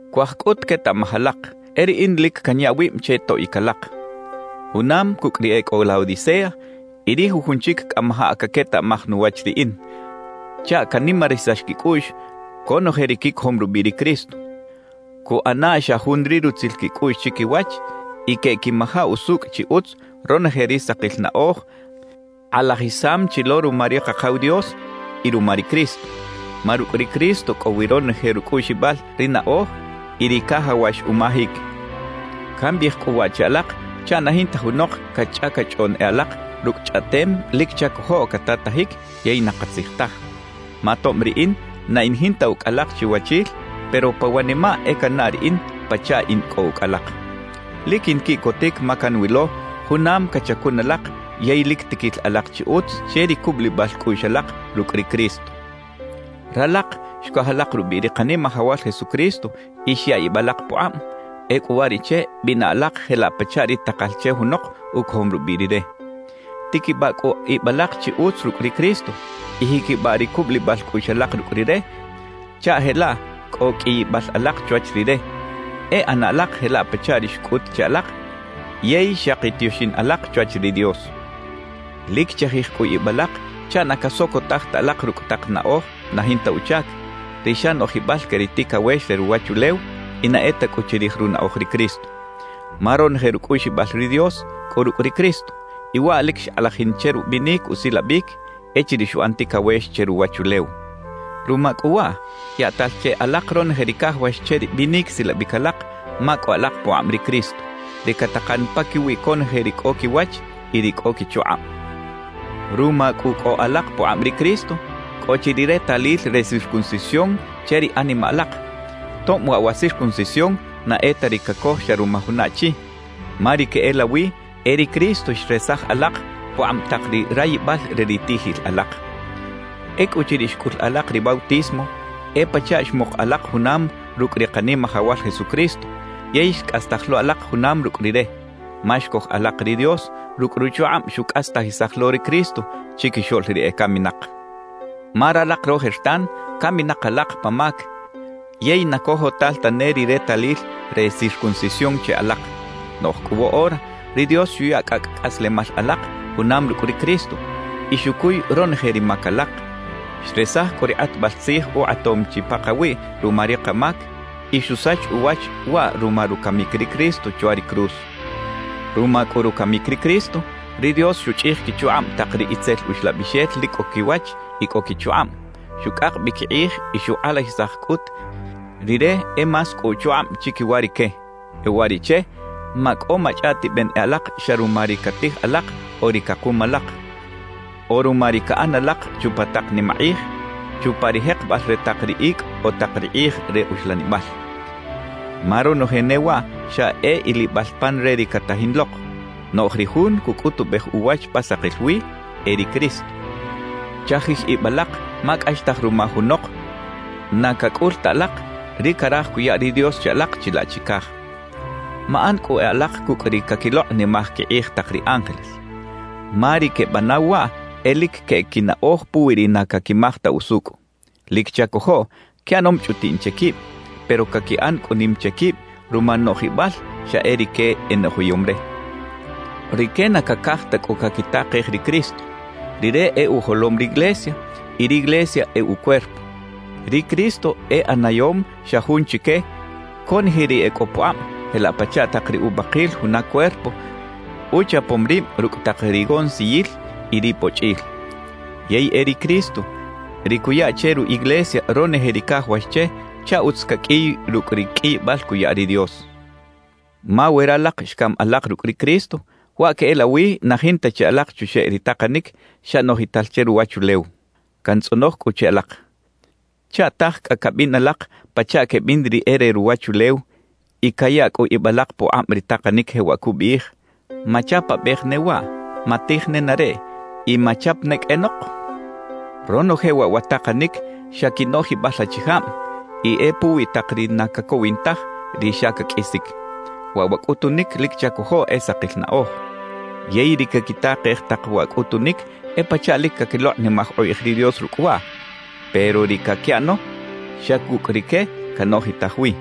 Cuaj cꞌut quetaꞌmaj alak, e riꞌin lic canya wib che toꞌic alak, junam cucꞌ ri e cꞌo Laodicea y ri jujun chic cꞌamajaꞌ caquetaꞌmaj nuwach riꞌin, chaꞌ canimarisax quicꞌuꞌx conoje ri quicojom rubiꞌ ri Cristo, cuꞌana xa jun ri rutzil quicꞌuꞌx chiquiwach y queꞌquimaja usucꞌ chi utz ronoje ri sakil naꞌoj kꞌalajisam chi lo ruma ri Kakaw Dios y ruma ri Cristo. Ma rucꞌ ri Cristo cꞌo wi ronoje rucꞌuꞌxibal ri naꞌoj y ri cajawax umajic. Cambiꞌij cꞌu waꞌ che alak chaꞌ na jinta junok cachꞌacachꞌoꞌn e alak rucꞌ chꞌaꞌtem lic chacojoꞌ catatajic yey na katzij taj. Ma tob riꞌin na in jinta ucꞌ alak chiwachil, pero pa wanimaꞌ e cannaꞌ riꞌin pachaꞌ in cꞌo ucꞌ alak. Lic quinquiꞌcotic ma canwilo junam cachacun alak yey lic tiquil alak chi utz che ri cubulibal cꞌuꞌx alak rucꞌ ri Cristo. Ralak xcoj alak rubiꞌ ri Kanimajawal Jesucristo y xya ib alak pukꞌab; ecꞌu uwariꞌche bina alak jelaꞌ pachaꞌ ri takal che junok ucojom rubiꞌ Rire. Tiquibaꞌ cꞌu ib alak chi utz rucꞌ ri Cristo y jiquibaꞌ ri cubulibal cꞌuꞌx alak rucꞌ Rire chaꞌ jelaꞌ cꞌo qꞌuiyibal alak chwach Rire; e ꞌana alak jelaꞌ pachaꞌ ri xcꞌut che alak yey xaki tioxin alak chwach ri Dios. Lic chajij cꞌu ib alak chaꞌ na casocotaj ta alak rucꞌ tak naꞌoj na jinta uchac, ri xa noꞌjibal que ri ticawex re ruwachulew y na e ta cꞌu chirij runaꞌoj ri Cristo. Ma ronoje rucꞌuꞌxibal ri Dios cꞌo rucꞌ ri Cristo, y waꞌ lic xkꞌalajin che rubinic usilabic echiriꞌ xuꞌan ticawex che ruwachulew. Ruma cꞌu waꞌ, yaꞌtal che alak ronoje ri cajawax che ri binic silabic alak ma cꞌo alak pukꞌab ri Cristo, ri catakan paquiwi conoje ri cꞌo quiwach y ri cꞌo quichukꞌab. Ruma cꞌu cꞌo alak pukꞌab ri Cristo, cꞌo chi ri retalil re circuncisión che ri animaꞌ alak, tob waꞌ wa circuncisión na e ta ri cacoj xa ruma juna achi; ma ri queꞌelawi e ri Cristo xresaj alak pukꞌab tak ri rayibal re ri tiꞌjil alak. Ecꞌuchiriꞌ xcꞌul alak ri bautismo, e pachaꞌ xmuk alak junam rucꞌ ri Kanimajawal Jesucristo yey xcꞌastaj lo alak junam rucꞌ Rire; ma xcoj alak ri Dios rucꞌ ruchukꞌab xucꞌastajisaj lo ri Cristo chiquixoꞌl ri ecaminak. Ma ralak rojertan caminak alak pa mac yey na cojotal tane ri retalil re circuncisión che alak. Noꞌj cꞌu woꞌora ri Dios xuya cꞌacꞌ cꞌaslemal alak junam rucꞌ ri Cristo y xucuy ronoje ri mac alak; xresaj cꞌu ri kꞌatbal tzij ukꞌatom chi pakawiꞌ ruma ri kamac y xusach uwach waꞌ ruma rucamic ri Cristo chwa ri cruz. Ruma cꞌu rucamic ri Cristo, ri Dios xuchꞌij quichukꞌab tak ri itzel uxlabixel lic cꞌo quiwach y cꞌo quichukꞌab, xucꞌak bi quikꞌij y xukꞌalajisaj cꞌut Rire e más cꞌo uchukꞌab chiquiwa rique. E uwariꞌche macꞌo machꞌaꞌtiben e alak xa ruma ri catij alak o ri cakum alak, o ruma ri caꞌan alak chupa tak nimakꞌij, chupa ri jekebal re tak ri icꞌ o tak ri kꞌij re uxlanibal. Ma ronoje ne waꞌ xa e ilibal pan re ri catajin lok; noꞌj ri Jun cucꞌutubej uwach pa sakil wi, e ri Cristo. Chajij ib alak ma cꞌaxtaj ruma junok na cacꞌul ta alak ri caraj cuya ri Dios che alak chilaꞌ chicaj. Maꞌan cꞌu e alak cucꞌ ri caquilokꞌnimaj quikꞌij tak ri ángeles. Ma ri quebanaw waꞌ e lic queꞌec quinaꞌoj puwi ri na caquimaj ta usucꞌ. Lic chacojoꞌ quiꞌanom chꞌutiꞌn che quib, pero caquiꞌan cꞌu nim che quib ruma noꞌjibal xa e rique enoꞌjiyom re. Rique na cacaj ta cꞌu caquitakej ri Cristo. Rire e ujolom riglesia y riglesia e ucuerpo. Ri Cristo e ꞌanayom xa jun chique conoje ri e cꞌo pukꞌab jelaꞌ pachaꞌ tak ri ubakil juna cuerpo uchapom rib rucꞌ tak rigonsiyil y ribochꞌil. Yey e ri Cristo ri cuya che ru iglesia ronoje ri cajawax che chaꞌ utz caqꞌuiy rucꞌ ri qꞌuiyibal cuya ri Dios. Ma we ralak xcam alak rucꞌ ri Cristo, waꞌ queꞌelawi na jinta chi alak chuxeꞌ ri takanic xa noꞌjital che ruwachulew. Cantzꞌonoj cꞌu che alak: ¿Chaꞌtaj cꞌa cabin alak pachaꞌ quebin ri e re ruwachulew y caya cꞌu ib alak pukꞌab ri takanic jewaꞌ cubiꞌij: «Machapabej ne waꞌ, matij nenareꞌ y machap ne qꞌuenok»? Ronoje waꞌ wa takanic xa quinoꞌjibal achijab y e puwi tak ri na cacowin taj, ri xa caqꞌuisic. Waꞌ wa cꞌutunic lic chacojoꞌ e sakil naꞌoj. Yey ri caquitakej tak wa cꞌutunic e pachaꞌ lic caquilokꞌnimaj ukꞌij ri Dios rucꞌ waꞌ, pero ri caquiꞌano xa cucꞌ rique canoꞌjitaj wi.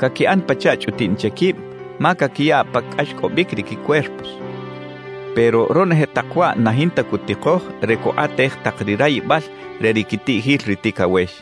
Caquiꞌan pachaꞌ chꞌutiꞌn che quib ma caquiya pa cꞌaxcꞌobic ri quicuerpos; pero ronoje tak waꞌ na jinta cutikoj re cukꞌatej tak ri rayibal re ri quitiꞌjil ri ticawex.